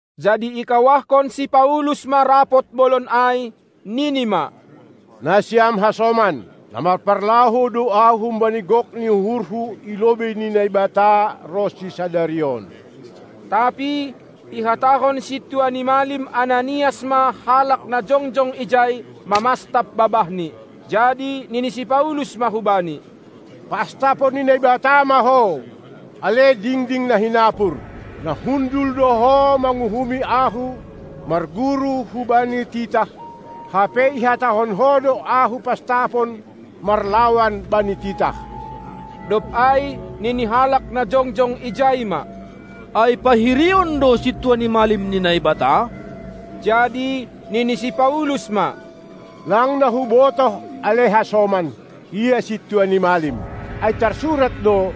Jadi ikawahkon si Paulus ma rapot bolon ai, nini ma: Nasiam hasoman, na marparlahou do ahu humbani gok ni uhurhu i lobei ni Naibata ronsi sadari on. Tapi ihatahon sintua ni malim Ananias ma halak na jongjong ijai mamastap babahni. Jadi nini si Paulus ma hubani: Pastapon ni Naibata ma ho, ale dingding na hinapur! Na hundul do ho manguhumi ahu marguru hubani titah, hape ihatahon ho do ahu pastapon marlawan bani titah! Dob ai nini halak na jongjong ijai ma: Ai pahirion do sintua ni malim ni Naibata? Jadi nini si Paulus ma: Lang na hubotoh, ale hasoman, ia sintua ni malim. Ai tarsurat do: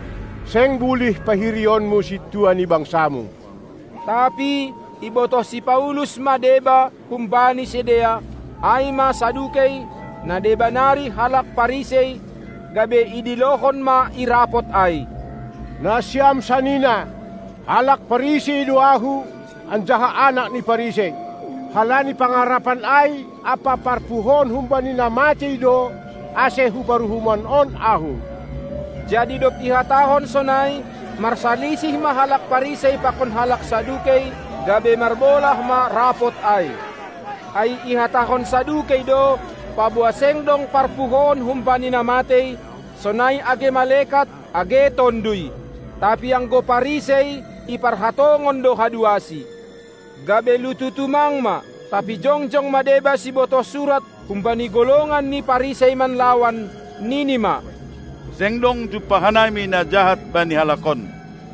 Seng bulih pahirionmu sintua ni bangsamu. Tapi ibotoh si Paulus ma deba humbani sidea, ai ma Sadukei, na deba nari halak Parisei, gabe idilohon ma i rapot ai: Nasiam sanina! Halak Parisei do ahu, anjaha anak ni Parisei. Halani pangarapan ai ampa parpuhoon humbani na matei do, ase hu paruhuman on ahu. Jadi dob ihatahon sonai, marsalisih ma halak Parisei pakon halak Sadukei, gabe marbolah ma rapot ai. Ai ihatahon Sadukei do, paboa seng dong parpuhoon humbani na matei, sonai age malekat, age tonduy. Tapi anggo Parisei, iparhatongon do haduasi. Gabe lutu tumang ma. Tapi jongjong ma deba sibotoh surat humbani golongan ni Parisei manlawan, nini ma: Seng dong jumpah hanami na jahat bani halak on.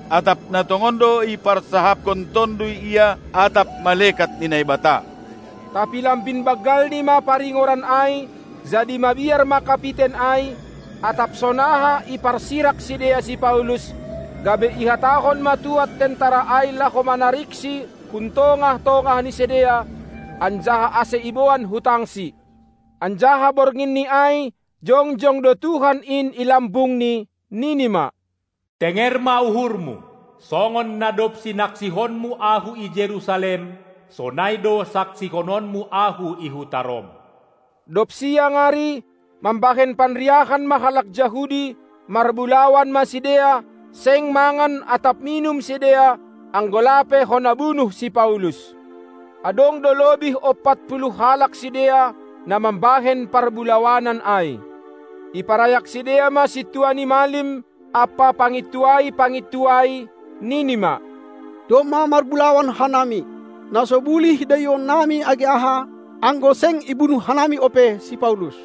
Atap na tongon do iparsahapkon Tonduy ia atap malekat ni Naibata? Tapi lambin banggalni ma paringoran ai, jadi mabiar ma kapiten ai, atap sonaha iparsirak sidea si Paulus, gabe ihatahon ma tuad tentara ai laho manariksi hun tongah-tongah ni sidea, anjaha ase iboan hu tangsi. Anjaha bornginni ai jongjong do Tuhan in i lambungni, nini ma: Tenger ma uhurmu! Songon na dob sinaksihonmu Ahu i Jerusalem, sonai do saksihononmu Ahu i huta Rom. Dob siang ari, mambahen panriahan ma halak Jahudi, marbulawan ma sidea, seng mangan atap minum sidea, anggo lape hona bunuh si Paulus. Adong do lobih ompat puluh halak sidea, na mambahen parbulawanan ai. Iparayak sidea ma sintua ni malim ampa pangintuai-pangintuai, nini ma: Domma marbulawan hanami, na so bulih daionnami age aha, anggo seng ibunuh hanami ope si Paulus.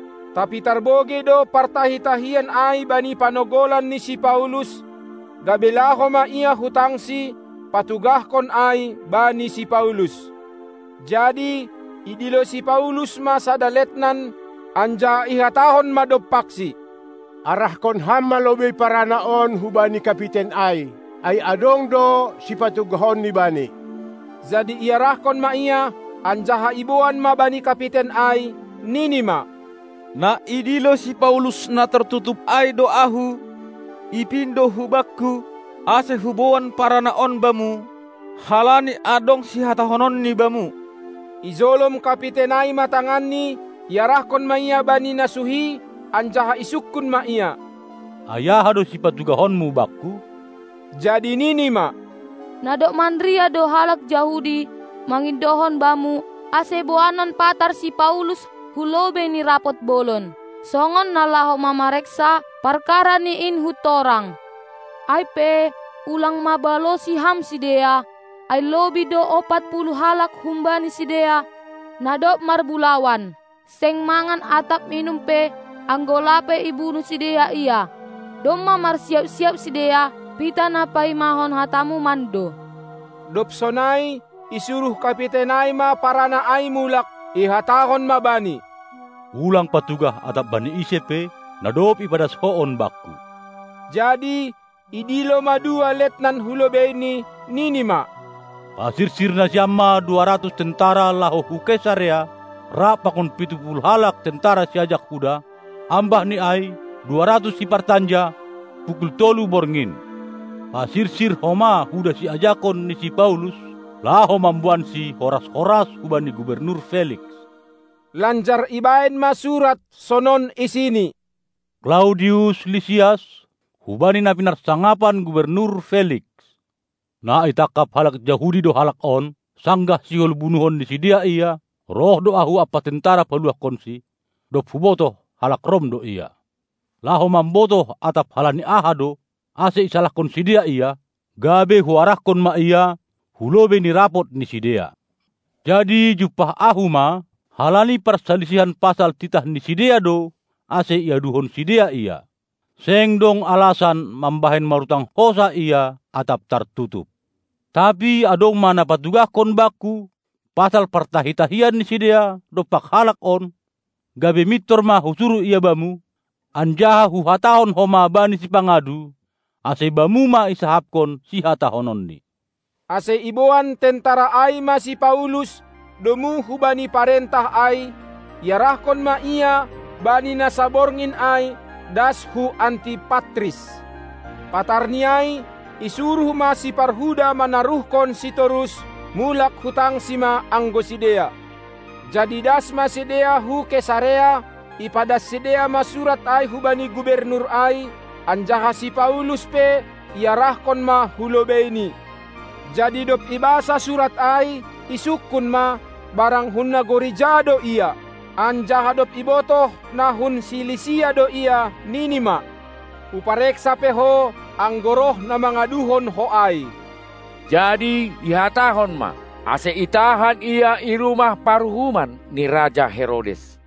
Tapi tarbogei do partahi-tahian ai bani panogolan ni si Paulus, gabe laho ma ia hu tangsi, patugahkon ai bani si Paulus. Jadi idilo si Paulus ma sada letnan, anjaha ihatahon ma dompaksi: Arahkon ham lobei parana on bani kapiten ai, ai adong do sipatugahonni bani. Jadi iarahkon ma ia, anjaha iboan ma bani kapiten ai, nini ma: Na idilo si Paulus na tartutup ai do ahu; ipindo hubakku, ase huboan parana on bamu, halani adong sihatahononni bamu. Ijolom kapiten ai ma tanganni, iarahkon ma ia bani na suhi, anjaha isungkun ma ia: Ai aha do sipatugahonmu bakku? Jadi nini ma: Na dob manriah do halak Jahudi, mangindohon bamu, ase boanon patar si Paulus hu lobei ni rapot bolon, songon na laho mamareksa parkarani in huntorang. Ai pe, ulang ma balosi ham sidea, ai lobih do ompat puluh halak humbani sidea, na dob marbulawan, seng mangan atap minum pe, anggo lape ibunuh sidea ia; domma marsiap-siap sidea, pitah na paimahon hatamu mando. Dob sonai isuruh kapiten ai ma parana ai mulak, ihatahon ma bani: Ulang patugah atap bani ise pe, na dob ipadas ho on bakku. Jadi idilo ma dua letnan hu lobeini, nini ma: Pasirsir nasiam ma dua ratus tentara laho hu Kesarea, rap pakon pitu puluh halak tentara siajak huda, ambah ni ai dua ratus sipartanja, pukul tolu borngin. Pasirsir homa huda siajakon ni si Paulus, laho mamboansi horas-horas hubani gubernus Feliks. Lanjar ibahen ma surat sonon isini: Klaudius Lisias hubani na pinarsangapan gubernur Feliks. Na itangkap halak Jahudi do halak on; sanggah sihol bunuhon ni sidea ia, roh do ahu ampa tentera paluahkonsi, dob hubotoh halak Rom do ia. Laho mambotoh atap halani aha do, ase isalahkon sidea ia, gabe huarahkon ma ia hulobei ni rapot ni sidea. Jadi jumpah ahu ma, halani parsalisihan pasal titah ni sidea do ase iaduhon sidea ia; seng dong alasan mambahen marutang hosah ia atap tartutup. Tapi adong ma na patugahkon bakku pasal partahi-tahian ni sidea dompak halak on, gabe mintor ma husuruh ia bamu, anjaha huhatahon homa bani sipangadu, ase bamu ma isahapkon sihatahononni. Ase iboan tentara ai ma si Paulus domu hubani parentah ai, iarahkon ma ia bani na saborngin ai das hu Antipatris. Patarni ai isuruh ma siparhuda manaruhkonsi torus; mulak hu tangsi ma anggo sidea. Jadi das ma sidea hu Kesarea, ipadas sidea ma surat ai hubani gubernur ai, anjaha si Paulus pe iarahkon ma hu lobeini. Jadi dob ibasa surat ai, isungkun ma, barang hun nagori ja do ia. Anjaha dob ibotoh na hun Silisia do ia, nini ma: Hupareksa pe ho, anggo roh na mangaduhon ho ai. Jadi ihatahon ma, ase itahan ia i rumah paruhuman ni raja Herodes.